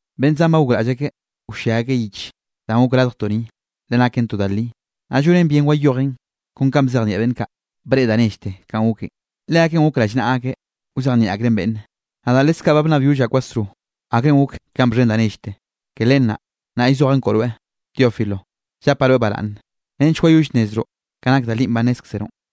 Beꞌnn zan ba gokraꞌll akeꞌ wllia akeꞌ yich danꞌ gok radjtoꞌ ni, le naken to da li, naꞌ llonen bien wayojen kon kanꞌ bzejnieꞌ beꞌnn kaꞌ, breꞌe da nellte kanꞌ goken. Leakeꞌn gok rallnaꞌa akeꞌ wzejnieꞌ akreꞌn beꞌnne. Nadaꞌ leskaꞌ ba bnnabyollaꞌ kwasro, akrenꞌ gok ka bxhen da nellte. Ke len naꞌ, nnaꞌ llzojaꞌn koꞌo rweꞌ, Teófilo, llapaꞌ rweꞌ baraꞌnne, nench wayoll nnezroꞌ ka nak da linꞌ ba nnézkzeroꞌn.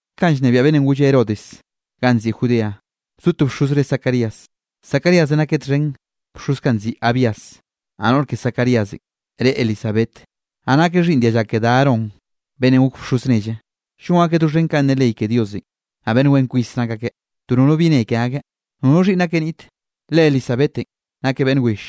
Kanꞌ llnebiaꞌ beꞌnnenꞌ golle Herodes ganꞌ nziꞌi Judea, bzo to bxoz re Zacarías. Zacaríasenꞌ nakeꞌ txhen bxoz kaꞌ nziꞌi Abías. Naꞌ noꞌr ke Zacaríasenꞌ re Elisabet, naꞌ nakeꞌ xhiꞌnn dialla ke da Aarón, beꞌnnenꞌ gok bxoz nelle. Llon akeꞌ doxhen kanꞌ ne ley ke Diosenꞌ, naꞌ beꞌnn wen kwis nak akeꞌ, to nono bi ne ke akeꞌ. Nono xhiꞌnn akeꞌ niꞌte, le Elisabetenꞌ nakeꞌ beꞌnn will,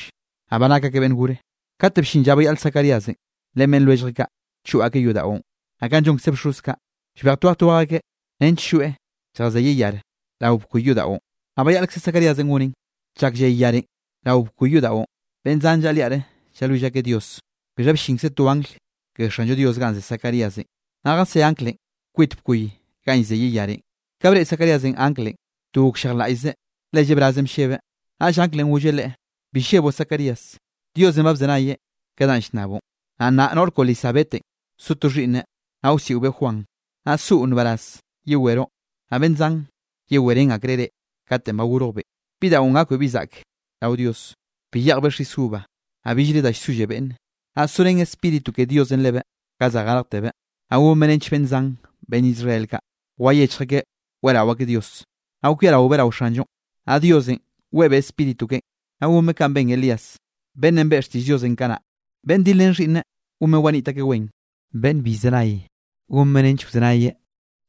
naꞌ ba nak akeꞌ beꞌnn gore. Kate bllin lla bayaꞌl Zacaríasenꞌ ren beꞌnn lwelljeꞌ kaꞌ, choꞌ akeꞌ yodaꞌon. Naꞌ kanꞌ llonkze bxoz kaꞌ, llbej twej twej akeꞌ nench lloeꞌ lljazeyeꞌ yar rao bkoy yodaꞌon. Naꞌ bayaꞌlkze Zacaríasenꞌ goneꞌn. Chak lley yarenꞌ rao bkoy yodaꞌon, beꞌnn zan llaꞌa liaꞌre llalwill akeꞌ Dios. Bixha bllinkze to angl ke Xanllo Dios ganꞌ ze Zacaríasenꞌ, naꞌ jasé anglenꞌ kwit bkoy ganꞌ llzeyeꞌ yarenꞌ. Ka breꞌe Zacaríasenꞌ anglenꞌ, to gokllejlaꞌllzeꞌ, le llebrazenꞌ bllebeꞌ. Naꞌll anglenꞌ golleꞌ leꞌe: —Bi lleboꞌ Zacarías, Diosenꞌ ba bzenayeꞌ ke danꞌ llnnaboꞌn, naꞌ nnaꞌ noꞌr koꞌo Elisabetenꞌ so to xhiꞌnneꞌ, naꞌ wsiꞌobeꞌ Juan. Naꞌ soꞌo nbaraz, yeweroꞌ, naꞌ beꞌnn zan yewerén akreꞌ reꞌ katenꞌ ba gorjbeꞌn. Bidaꞌon gakbeꞌ bi zaꞌk rao Dios, bi yeꞌjbeꞌ xis uva, naꞌ billre da llsolle beꞌnne, naꞌ sorén Spíritu ke Diosenꞌ lebeꞌ ka za garjterbeꞌ. Naꞌ gonbeꞌ nench beꞌnn zan beꞌnn Israel kaꞌ, wayechj akeꞌ weꞌrao akeꞌ Dios. Naꞌ kwiaraobeꞌ rao Xanllonꞌ, naꞌ Diosenꞌ weꞌebeꞌ Spíritu keꞌen, naꞌ gonbeꞌ kanꞌ ben Elías, beꞌnnenꞌ beꞌe xtiꞌll Diosenꞌ kanaꞌ. Beꞌnn dilrén xhiꞌnneꞌ, gonbeꞌ waniꞌt akeꞌ wen; beꞌnn bi llzenay, gonbeꞌ nench wzenayeꞌ.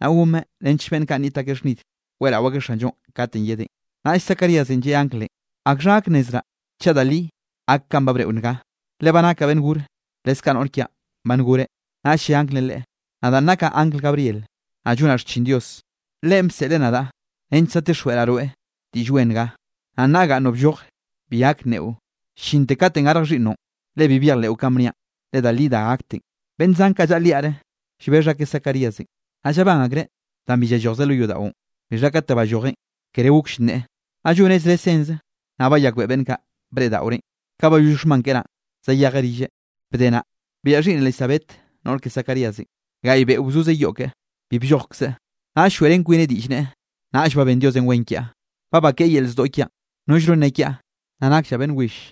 Naꞌ gonbeꞌ nench beꞌnn kaꞌ nniꞌt akeꞌ xhnid, weꞌrao akeꞌ Xanllonꞌ katenꞌ yedeꞌn. Naꞌll Zacaríasenꞌ lleꞌe anglenꞌ: —¿Akxha gak nnezraꞌ chaꞌ da li gak kanꞌ ba bneꞌo nga? Le ba nakaꞌ beꞌnn gore, leskaꞌ noꞌr kiaꞌn ba ngoreꞌ. Naꞌll lle anglenꞌ leꞌe: —Nadaꞌn nakaꞌ angl Gabriel, naꞌ llonaꞌ xchin Dios, Leꞌen bseꞌleꞌ nadaꞌ nench zadtixjweꞌraꞌ rweꞌ diꞌll wen nga. Naꞌ nnaꞌ gaꞌnnoꞌ blloje, bi gak nneꞌo llinte katenꞌ garj xhiꞌnnoꞌn, le bi byejleꞌo kanꞌ bniaꞌn, le da li da gakten. Beꞌnn zan kaꞌ llaꞌa liaꞌre, llbexh akeꞌ Zacaríasenꞌ, naꞌ llabán akreꞌ danꞌ bi llallojzeꞌ lo yodaꞌon. Bixha kate ballojeꞌn, kere gokll nneꞌe, naꞌ lloneꞌ zre senze, naꞌ bayakbeꞌe beꞌnn kaꞌ, breꞌdaꞌoreꞌn. Ka bayoll xhman keꞌen naꞌ zayejeꞌ rilleꞌ. Bde naꞌ, biaꞌa xhiꞌnn Elisabet noꞌr ke Zacaríasenꞌ. Gaꞌy beꞌo bzozeꞌ yoꞌ keꞌe, bi bllojkzeꞌ, naꞌll lloeꞌrén kwineꞌ diꞌll neꞌe: “Nnaꞌll ba ben Diosenꞌ wen kiaꞌ, ba bakeꞌe yel zdoꞌ kiaꞌn, nollno nne kiaꞌ nna nakllaꞌ beꞌnn will.”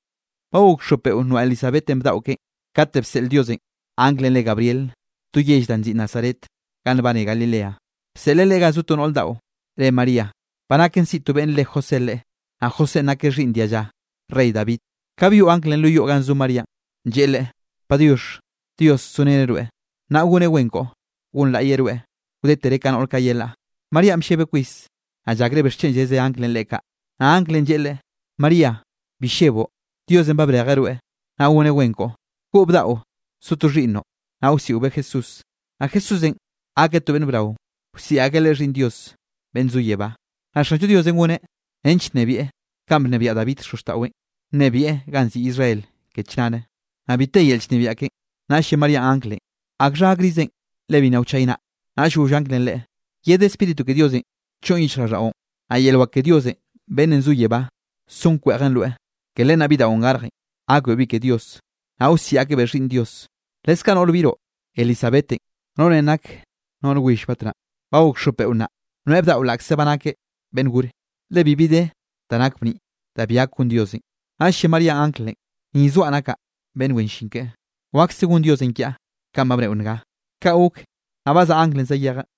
Ba gok xop beꞌo noaꞌ Elisabetenꞌ bdaꞌo keꞌen, kate bseꞌl Diosenꞌ anglenꞌ re Gabriel to yell da nziꞌi Nazaret ganꞌ nbane Galilea. Bseꞌleꞌ leꞌe ga zo to noꞌr daꞌo, re María, ba naken siꞌi to beꞌnn re José leꞌe, naꞌ Josénꞌ nakeꞌ xhiꞌnn dialla rey David. Ka byoꞌ anglenꞌ lo yoꞌ ganꞌ zo Maríanꞌ, lleꞌe leꞌe: —¡Padiox, Dios zoreneꞌ rweꞌ, nnaꞌ goneꞌ wen koꞌo, gonlaꞌyeꞌ rweꞌ wdetere ka noꞌr kaꞌ yelaꞌ! Maríanꞌ bllebeꞌ kwis, naꞌ llakreꞌ bixchen lleze anglenꞌ leꞌe kaꞌ. Naꞌ anglenꞌ lleꞌe leꞌe: —María, bi lleboꞌ, Diosenꞌ ba brejeꞌ rweꞌ, naꞌ goneꞌ wen koꞌo. Goꞌo bdaꞌo, so to xhiꞌnnoꞌ, naꞌ wsiꞌobeꞌ Jesús. Naꞌ Jesúsenꞌ gakeꞌ to beꞌnn brao, wsiꞌi akeꞌ Leꞌe Xhiꞌnn Dios beꞌnn zo yebá. Naꞌ Xanllo Diosenꞌ goneꞌ nench nnebieꞌ kanꞌ bnebiaꞌ David xozxtaꞌweꞌn. Nnebieꞌ ganꞌ nziꞌi Israel ke chnare, naꞌ bi te yel llnebiaꞌ keꞌen. Naꞌll lle Maríanꞌ anglenꞌ: —¿Akxha gakrizen le bi nna wchaynaꞌa? Naꞌll goll anglenꞌ leꞌe: —Yed Spíritu ke Diosenꞌ choꞌn yichjraꞌlldaꞌon, naꞌ yel wak ke Dios beꞌnn zo yebá son kweꞌjen rweꞌ, ke len naꞌ bidaꞌon garjenꞌ gakbeꞌ bi ke Dios, naꞌ wsiꞌi akebeꞌ Xhiꞌnn Dios. Leskaꞌ noꞌr biroꞌ, Elisabetenꞌ, noꞌrenꞌ nak noꞌr will batnaꞌ, ba gok xop beꞌo nnaꞌ, noeꞌ bdaꞌo laꞌkze ba nakeꞌ beꞌnn gore. Le bibi de da nak bniꞌ, da bi gak gon Diosenꞌ. Naꞌll lle Maríanꞌ anglenꞌ: —Ni zoaꞌ nakaꞌ beꞌnn wen llin keꞌe, wakse gon Diosenꞌ kiaꞌ kanꞌ ba bneꞌo nga. Kaꞌ gok, naꞌ bazaꞌa anglenꞌ zayejeꞌ.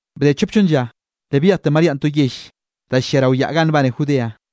Bde chop chonn lla, le byejte Maríanꞌ to yell da llia rao yaꞌ ganꞌ nbane Judea.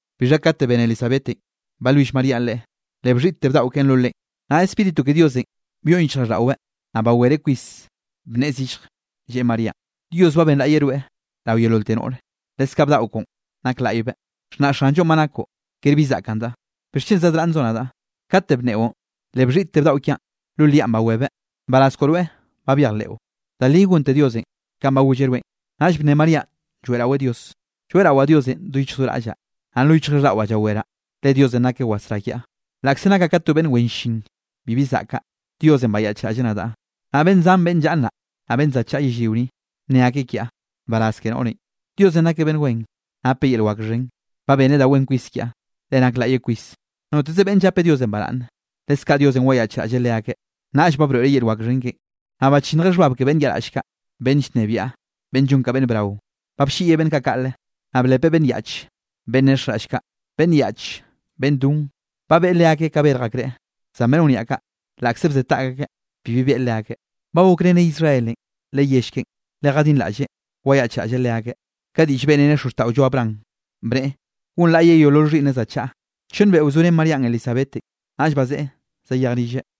Bixha kate bene Elisabetenꞌ balwill Maríanꞌ leꞌe, le bxhiꞌtte bdaꞌo keꞌen lo leꞌen, naꞌ Spíritu ke Diosenꞌ byoꞌn yichjraꞌlldaꞌweꞌ. Naꞌ bawereꞌ kwis bnneꞌe zillj, lleꞌe Maríanꞌ: —Dios ba benlaꞌyeꞌ rweꞌ rao yeololte noꞌre, leskaꞌ bdaꞌo koꞌon nak laꞌybeꞌ. Xhnaꞌ Xanllo ba nakoꞌ, ker bi zaꞌkandaꞌ. ¿Bixchen zadraꞌnnzoꞌ nadaꞌ? Kate bnneꞌon, le bxhiꞌtte bdaꞌo kiaꞌn lo liaꞌn bawebeꞌ. Nbaraz koꞌo rweꞌ ba byejleꞌo, da li gonte Diosenꞌ kanꞌ ba golleꞌ rweꞌn. Naꞌll bne Maríanꞌ lloeꞌraweꞌ Dios: Lloeꞌrawaꞌ Diosenꞌ do yichj do raꞌllaꞌ. Naꞌ lo yichjraꞌlldaꞌwaꞌ llaweraꞌ, le Diosenꞌ nakeꞌ wasrá kiaꞌ. Laꞌkze nakaꞌ ka to beꞌnn wen llin, bibi zaꞌkaꞌ, Diosenꞌ bayaꞌchraꞌlleꞌ nadaꞌ. Naꞌ beꞌnn zan beꞌnn llaꞌa nnaꞌ, naꞌ beꞌnn za chaꞌa yellrio ni, nne akeꞌ kiaꞌ: “Nbaraz ke noꞌrenꞌ.” Diosenꞌ nakeꞌ beꞌnn wen, napeꞌ yel wak xhen, ba beneꞌ da wen kwis kiaꞌ. ¡Leꞌe nak laꞌye kwis! Noteze beꞌnn llape Diosenꞌ baraꞌnne, leskaꞌ Diosenꞌ wayaꞌchraꞌlleꞌ leakeꞌ. Naꞌll ba broeꞌreꞌ yel wak xhen keꞌen, naꞌ bachinnjeꞌ xhbab ke beꞌnn yaꞌraꞌll kaꞌ. Beꞌnn llnebiaꞌ, beꞌnn llon ka beꞌnn brao, ba blliꞌyeꞌ beꞌnn kaꞌ kaꞌle, naꞌ blepeꞌ beꞌnn yaꞌch, beꞌnn nexjraꞌll kaꞌ. Beꞌnn yaꞌche, beꞌnn don, ba beꞌe leakeꞌ ka yerj akreꞌ, zan beꞌnn wniaꞌ kaꞌ, laꞌkze bze taꞌk akeꞌ, bibi beꞌe leakeꞌ. Ba gokreneꞌ Israelenꞌ, le yell keꞌen, le jadinraꞌlleꞌ wayaꞌchraꞌlleꞌ leakeꞌ. Ka diꞌll beꞌreneꞌ xozxtaꞌollo Abraham, bneꞌe gonlaꞌyeꞌ yeolol xhiꞌnneꞌ za chaꞌa. Chonn beꞌo bzorén Maríanꞌ Elisabetenꞌ, naꞌll bazeꞌe zayej rilleꞌ.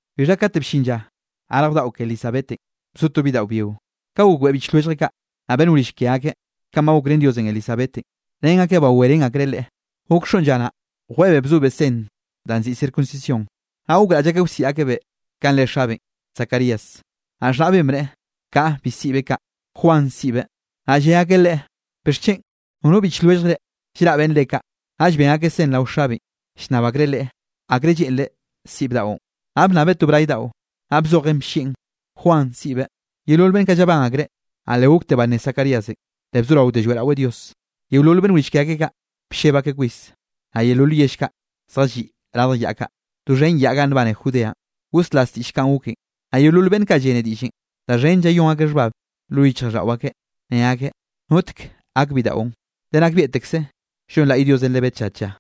Bixha kate bllin lla garj bdaꞌo ke Elisabetenꞌ, bzo to bidaꞌo byio. Ka gokbeꞌe biꞌch lwelljeꞌ kaꞌ, naꞌ beꞌnn wrill ke akeꞌ, kanꞌ ba gokrén Diosenꞌ Elisabetenꞌ, ren akeꞌ bawerén akreꞌ leꞌe. Gok xoꞌn lla naꞌ, jweꞌebeꞌ bzobeꞌ sen danꞌ nziꞌi circuncisión. Naꞌ gokraꞌll akeꞌ wsiꞌi akebeꞌ kanꞌ re xabeꞌn, Zacarías. Naꞌ xhnaꞌbeꞌn bneꞌe: —Kaꞌa, bi siꞌbeꞌ kaꞌ, Juan, siꞌbeꞌ. Naꞌ lle akeꞌ leꞌe: —¿Bixchen? Nono biꞌch lwelljre llraꞌ beꞌnn re kaꞌ. Naꞌll ben akeꞌ sen rao xabeꞌn, llnnab akreꞌ leꞌe akre lleꞌnreꞌ siꞌi bdaꞌon. Naꞌ bnnabeꞌ to bray daꞌo, naꞌ bzojeꞌn bllieꞌn: “Juan, siꞌbeꞌ.” Yeolol beꞌnn kaꞌ llabán akreꞌ. Naꞌ le gokte banné Zacaríasenꞌ, le bzoraote lloeꞌraweꞌ Dios. Yeolol beꞌnn wrill ke akeꞌ kaꞌ, blleb akeꞌ kwis, naꞌ yeolol yell kaꞌ zjalliꞌ radj yaꞌ kaꞌ, doxhen yaꞌn ganꞌ nbane Judeanꞌ, goslas diꞌll kanꞌ goken. Naꞌ yeolol beꞌnn kaꞌ llene diꞌllenꞌ, da xhen llayón akeꞌ xhbab lo yichjraꞌlldaꞌo akeꞌ, ne akeꞌ: —¿Notek gak bidaꞌon? Le nakbieꞌtekze llonlaꞌy Diosenꞌ lebeꞌ tlla tlla.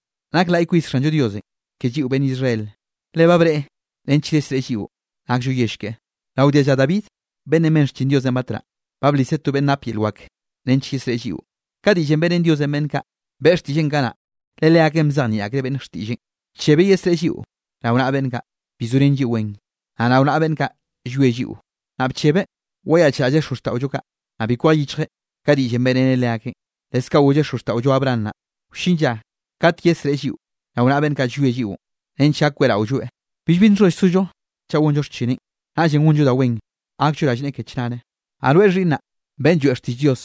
Nak laꞌy kwis Xanllo Diosenꞌ ke lliꞌo beꞌnn Israel, le ba breꞌe nench yesreꞌe lliꞌo nakllo yell keꞌe. Rao dialla David beꞌnn ben xchin Dios batnaꞌ, ba bliseꞌ to beꞌnn nap yel wak nench yesreꞌe lliꞌo. Ka diꞌllenꞌ beꞌrén Diosenꞌ beꞌnn kaꞌ, beꞌe xtiꞌlleꞌn kanaꞌ, le leakeꞌn bzejnieꞌ akreꞌ beꞌnn xtiꞌlleꞌn. Bchebeꞌ yesreꞌe lliꞌo rao naꞌa beꞌnn kaꞌ, bi zorén lliꞌo wen, naꞌ rao naꞌa beꞌnn kaꞌ, llwie lliꞌo. Naꞌ bchebeꞌ wayaꞌchraꞌlleꞌ xozxtaꞌollo kaꞌ, naꞌ bi kwej yichjeꞌ ka diꞌllenꞌ beꞌreneꞌ leakeꞌn. Leskaꞌ golleꞌ xozxtaꞌollo Abraham naꞌ, wllin lla kate yesreꞌe lliꞌo rao naꞌa beꞌnn kaꞌ llwie lliꞌon, nench gak weꞌraolloeꞌ, billbi nxholl sollo chaꞌ gonllo xchineꞌn. Naꞌllenꞌ gonllo da wen, gakllo rallneꞌe ke chnare. Naꞌ rweꞌ, xhiꞌnnaꞌ, beꞌnn lloeꞌ xtiꞌll Dios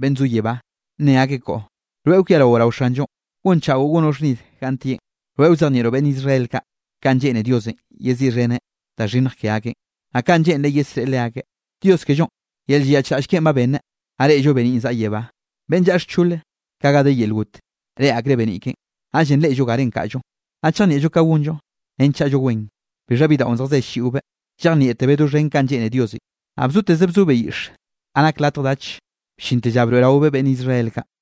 beꞌnn zo yebá, nne akeꞌ koꞌo, rweꞌ kwiarao rao Xanllonꞌ, gonchaꞌo gonoꞌ xhnid ganꞌ tieꞌn. Rweꞌ wzejnieꞌroꞌ beꞌnn Israel kaꞌ, kanꞌ lleꞌne Diosenꞌ yeziꞌxheneꞌ da xhinnj ke akeꞌn, naꞌ kanꞌ lleꞌnreꞌ yesreꞌe leakeꞌ. Dios kellonꞌ, yel llayaꞌchraꞌll keꞌen ba beneꞌ, nnaꞌ reꞌllo beniꞌn zaꞌa yebá. Beꞌnn llaꞌa xchole, ka ga de yel got, reꞌe akreꞌ beniꞌ keꞌen, naꞌllenꞌ reꞌllo garenꞌ kaꞌllo, naꞌ chejnieꞌllo ka gonllo nench chaꞌllo wen. Bixha bidaꞌon zjaze ll-lliꞌobeꞌ, llejnieꞌtebeꞌ doxhen kanꞌ lleꞌne Diosenꞌ, naꞌ bzoteze bzobeꞌ yiꞌxe ga nak latj dach, bllinte lla broeꞌraobeꞌ beꞌnn Israel kaꞌ.